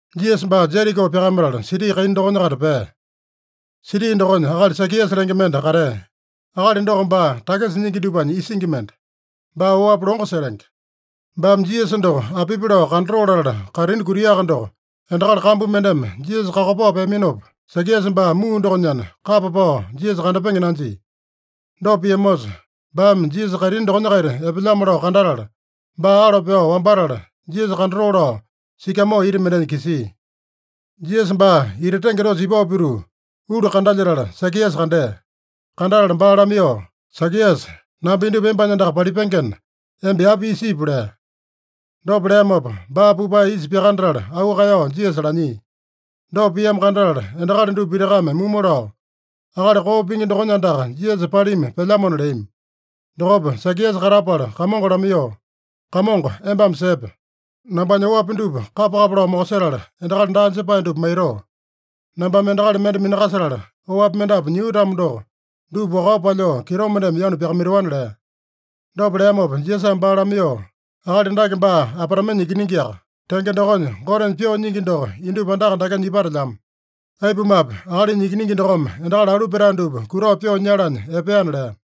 Jisasa baa Jeriko pyakamatala siti kaina dokonya-kaita pea. Siti dokonya akali Sakiasa lenge mende katea. Akali doko baa takisa nyingi dupanya isingi mende. Baa oapi longo setenge. Baame Jisasa doko apipi lao kandatoo latala kaitini kutiaka doko, endakali kambu mendeme Jisasa kakopao peaminopa, Sakiasa baa muu dokonyana, kapa pao Jisasa kandapenge nanjia. Dopa piamosa, baame Jisasa kaitini dokonya-kaita epelyamo lao kandatala, baa alo pyao wambatala, Jisasa kandatoo lao sikamoo ita mendenya kisia. Jisasa baa ita tenge dosa ipao pituu, ulu kandalyetala, Sakiasa kandea. Kandatala baa lamaiyoo, “Sakiasa, namba indupa embanya andaka palipengena, emba yapa isa ipu” lea. Dopa leamopa baa pupae isa pyakanatala auu kaeyao Jisasa lanyia. Dopa piamo kandatala endakali dupa pitakame mumu lao, “Akali koo pingi dokonya andaka Jisasa palima pelyamona” leami. Dokopa Sakiasa katapala Kamongo lamaiyoo, “Kamongo, embame sepe! Nambanya oapi dupa kapa-kapa lao mokosetala, endakali daa jepae dupa maitoo. Nambame endakali mende minakasetala, oapi mendapu nyio-tamo doko, dupa wakao palyoo kitomendeme yanu pyakamaitoana” lea. Dopa leamopa Jisasame baa lamaiyoo, “Akali dake baa Abraamenya ikiningiaka. Tenge dokonya, Gotenya pyoo nyingi doko indupa andaka dakenya ipatelyamo. Aipumape, Akalinya Ikiningi dokome endakali alu petae dupa kutao pyoo nyalanya epeana” lea.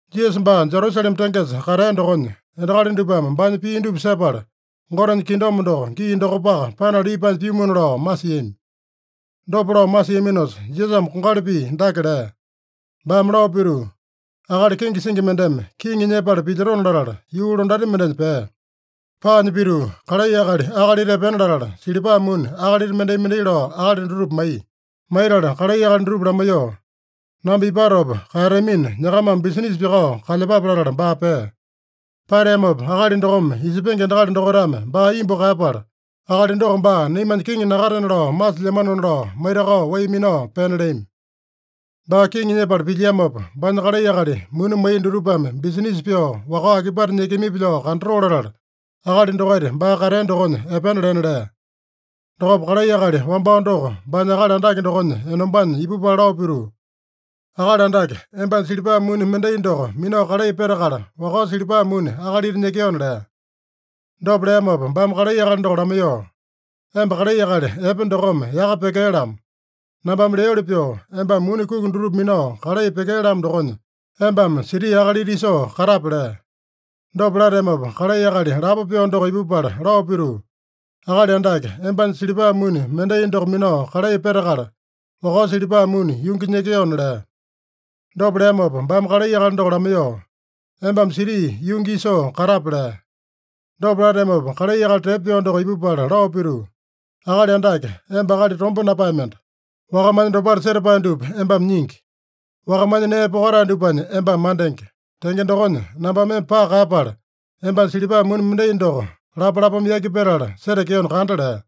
Jisasa baa Jerusalema tengesa katea dokonya, endakali dupame baanya pii dupa sepala, Gotenya kingdom doko gii dokopaka panala ipanya pyumuna lao masiami. Dopa lao masiaminosa Jisasame kongali pii dake lea. Baame lao pituu, “Akali kenge singi mendeme kiŋi nyepala pilyotona latala, yuu londati mendenya pea. Paanya pituu, kalai akali akalita epena latala, silipa muni akalita mendai-mendai lao akali dutupa maiya. Maitala kalai akali dutupa lamaiyoo, ‘Namba ipatopa kaeyatamina, nyakamame bisinisa pyakao kalyepape’ latala baa pea. Pateamopa akali dokome isepenge endakali dokaitame baa imbu kaeyapala, ‘Akali doko baa naimanya kiŋi nakatena lao masilyamanona’ lao maitakao wai minao pena leami. Baa kiŋi nyepala pilyiamopa, baanya kalai akali muni maiya dutupame bisinisa pyoo, wakao akipate nyekeamipi lao kandatoo latala, akali dokaita baa katea dokonya epena lena lea. Dokopa kalai akali wambao doko baanya akali andake dokonya enombanya ipupala lao pituu, ‘Akali Andake, embanya silipa muni mendai doko minao kalai petakala, wakao silipa muni akalita nyekeona’ lea. Dopa leamopa baame kalai akali doko lamaiyoo, ‘Emba kalai akali epe dokome yaka pyekee-lamo! Nambame leoli pyoo embame muni kuki dutupa minao kalai pyekee-lamo dokonya, embame siti akalita isoo katape’ lea. Dopa lateamopa, kalai akali lapo pyoo doko ipupala lao pituu, ‘Akali Andake, embanya silipa muni mendai doko minao kalai petakala, wakao silipa muni yungi nyekeona’ lea. Dopa leamopa baame kalai akali doko lamaiyoo, ‘Embame siti yungi isoo katape’ lea. Dopa lateamopa, kalai akali tepo pyoo doko ipupala lao pituu, ‘Akali Andake, emba akali tomba napae mende. Wakamanya dopale setapae dupa embame nyingi. Wakamanya nee pokatae dupanya embame mandenge. Tenge dokonya, nambame emba paka kaeyapala, embanya silipa muni mendai doko lapalapame yaki petala setekeona kanda’ lea.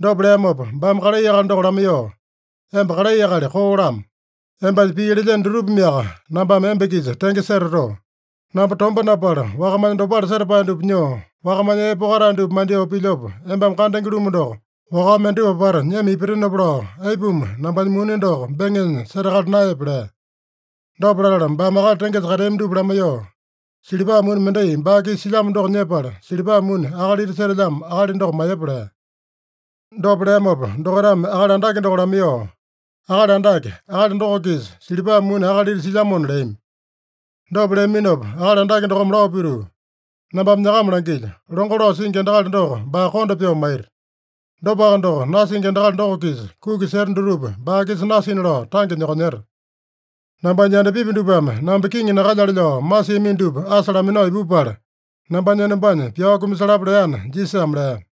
Dopa leamopa baame kalai akali doko lamaiyoo, ‘Emba kalai akali koo-lamo. Embanya pii lelyeno dutupameaka nambame emba-kisa tenge setatoo. Namba tomba napala, wakamanya dopale setapae dupa nyoo, wakamanya nee pokatae dupa mandyoo pilyopa embame kandenge-lumu doko, wakao mendatupa apata nyema ipatenopa lao, aipuma nambanya muni doko beŋenya setakala naeyepe?’ lea. Dopa latala baame akali tengesa kateami dupa lamaiyoo, ‘Silipa muni mendai baa-kisa silyamo doko nyepala, silipa muni akalita setelyamo akali doko maiyepa’ lea. Dopa leamopa dokaitame akali andake doko lamaiyoo, ‘Akali Andake, akali doko-kisa silipa muni akalita silyamona’ leami. Dopa leaminopa akali andake dokome lao pituu, ‘Nambame nyakama langilyo: Longo lao singi endakali doko baa konda pyoo maita. Dopaka doko, nasingi endakali doko-kisa kuki seta dutupa baa-kisa nasina lao tange nyokonyeta. Nambanya yandapipi dupame namba kiŋi nakalyale lao masiamino dupa asa laminao ipupala, nambanya enombanya pyao kumasalapa’ leana” Jisasame lea.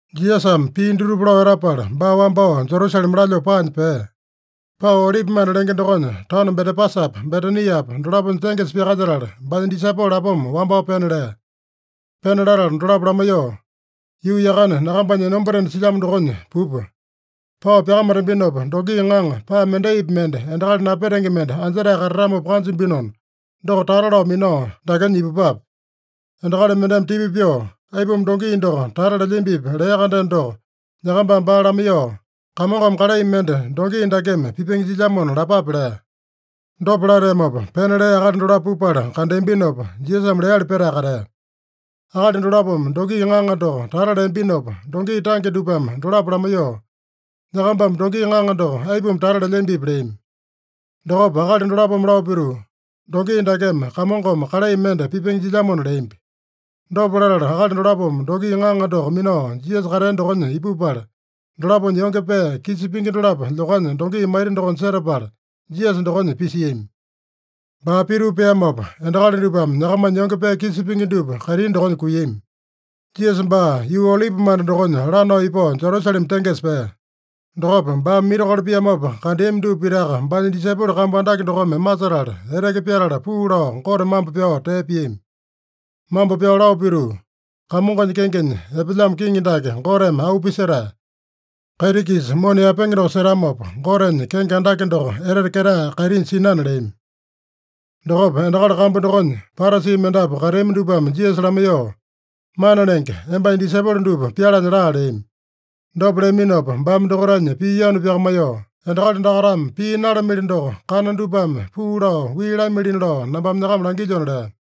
Jisasame pii dutupa lao etapala baa wambao Jerusalema lalyoo paanya pea. Pao Olipimanda lenge dokonya taono Betepasapa, Betaniapa dolaponya tengesa pyakalyetala, baanya disaipolo lapoma wambao pena lea. Pena latala dolapo lamaiyoo, “Yuu yakane nyakambanya enombatena silyamo dokonya pupa. Pao pyakamatambinopa, dongi ŋaŋa, paa mendaipi mende endakali napetenge mende anjetae katatamopa kanjambinona, doko tata lao minao dakenya ipupape. Endakali mendeme tipa pyoo, ‘Aipuma dongi doko tata lelyambipi?’ lea-kandeno doko, nyakambame baa lamaiyoo, ‘Kamongome kalai mende dongi dakeme pipenge jilyamona’ lapape” lea. Dopa lateamopa, pena lea akali dolapo pupala kandeambinopa, Jisasame leali petae katea. Akali dolapome dongi ŋaŋa doko tata leambinopa, dongi tange dupame dolapo lamaiyoo, “Nyakambame dongi ŋaŋa doko aipuma tata lelyambipi?” leami. Dokopa akali dolapome lao pituu, “Dongi dakeme Kamongome kalai mende pipenge jilyamona” leambi. Dopa latala, akali dolapome dongi ŋaŋa doko minao Jisasa katea dokonya ipupala, dolaponya yonge pee kisa pingi dolapo lyokanya dongi maita dokonya setapala, Jisasa dokonya pisiami. Baa pituu peamopa, endakali dupame nyakamanya yonge pee kisa pingi dupa kaitini dokonya kuiyami. Jisasa baa yuu Olipimanda dokonya lanao ipao Jerusalema tengesa pea. Dokopa baame mirakolo piamopa kandeami dupa pitaka baanya disaipolo kambu andake dokome masetala, eteke pyatala puu lao Gote mambo pyao tee piami. Mambo pyao lao pituu, “Kamongonya kengenya epelyamo kiŋi dake Goteme auu pisetae. Kaiti-kisa mona yaepenge doko setamopa, Gotenya kenge andake doko etete ketae kaitinya sinana” leami. Dokopa endakali kambu dokonya Parasi mendapu kateami dupame Jisasa lamaiyoo, “Mana Lenge, embanya disaipolo dupa pyalanya laa” leami. Dopa leaminopa baame dokaitanya pii yanu pyakamaiyoo, “Endakali dakaitame pii nalamili doko, kana dupame puu lao wii lamilina lao nambame nyakama langilyona” lea.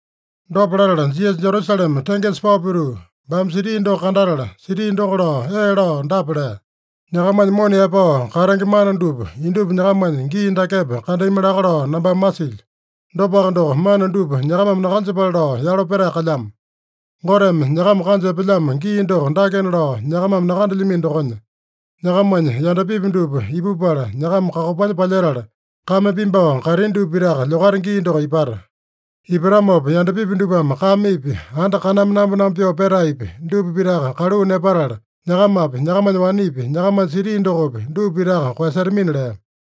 Dopa latala, Jisasa Jerusalema tengesa pao pituu, baame siti doko kandatala, siti doko lao ee lao dapa lea: “Nyakamanya mona yaepao katenge mana dupa indupa nyakamanya gii dakepa kandami laka lao nambame masilyo. Dopaka doko, mana dupa nyakamame nakanjepale lao yalo petae kalyamo. Goteme nyakama kanja epelyamo gii doko dakena lao nyakamame nakandelyamino dokonya, nyakamanya yandapipi dupa ipupala, nyakama kakopanya palyetala, kame pimbao, kaitini dupa pitaka lyokata gii doko ipata. Ipatamopa yandapipi dupame kamepi, anda kaname namba-namba pyoo petaepi, dupa pitaka kaluu nepatala, nyakamapi, nyakamanya wanepi, nyakamanya siti dokopi, dupa pitaka koeyasetamina” lea.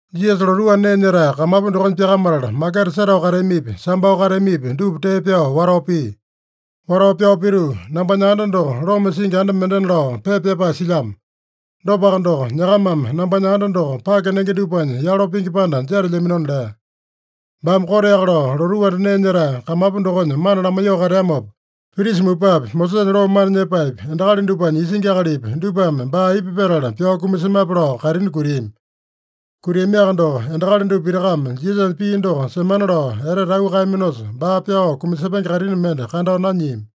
Jisasa lotuu anda nee nyetae kamapu dokonya pyakamatala, maketa setao kateamipi, sambao kateamipi, dupa tee pyao watao pia. Watao pyao pituu, “ ‘Nambanya anda doko loma singi anda mendena’ lao pepa pyapae silyamo. Dopaka doko, nyakamame nambanya anda doko pake nenge dupanya yalo pingi panda jetelyaminona” lea. Baame koteaka lao lotuu anda nee nyetae kamapu dokonya mana lamaiyoo kateamopa, prisa mupapi, Mosesanya loo mana nyepaepi, endakali dupanya isingi akalipi, dupame baa aipa petala pyao kumasemape lao kaitini kutiami. Kutiamiaka doko, endakali dupa pitakame Jisasanya pii doko semana lao etete auu kaeyaminosa, baa pyao kumasepenge kaitini mende kandao nanyiami.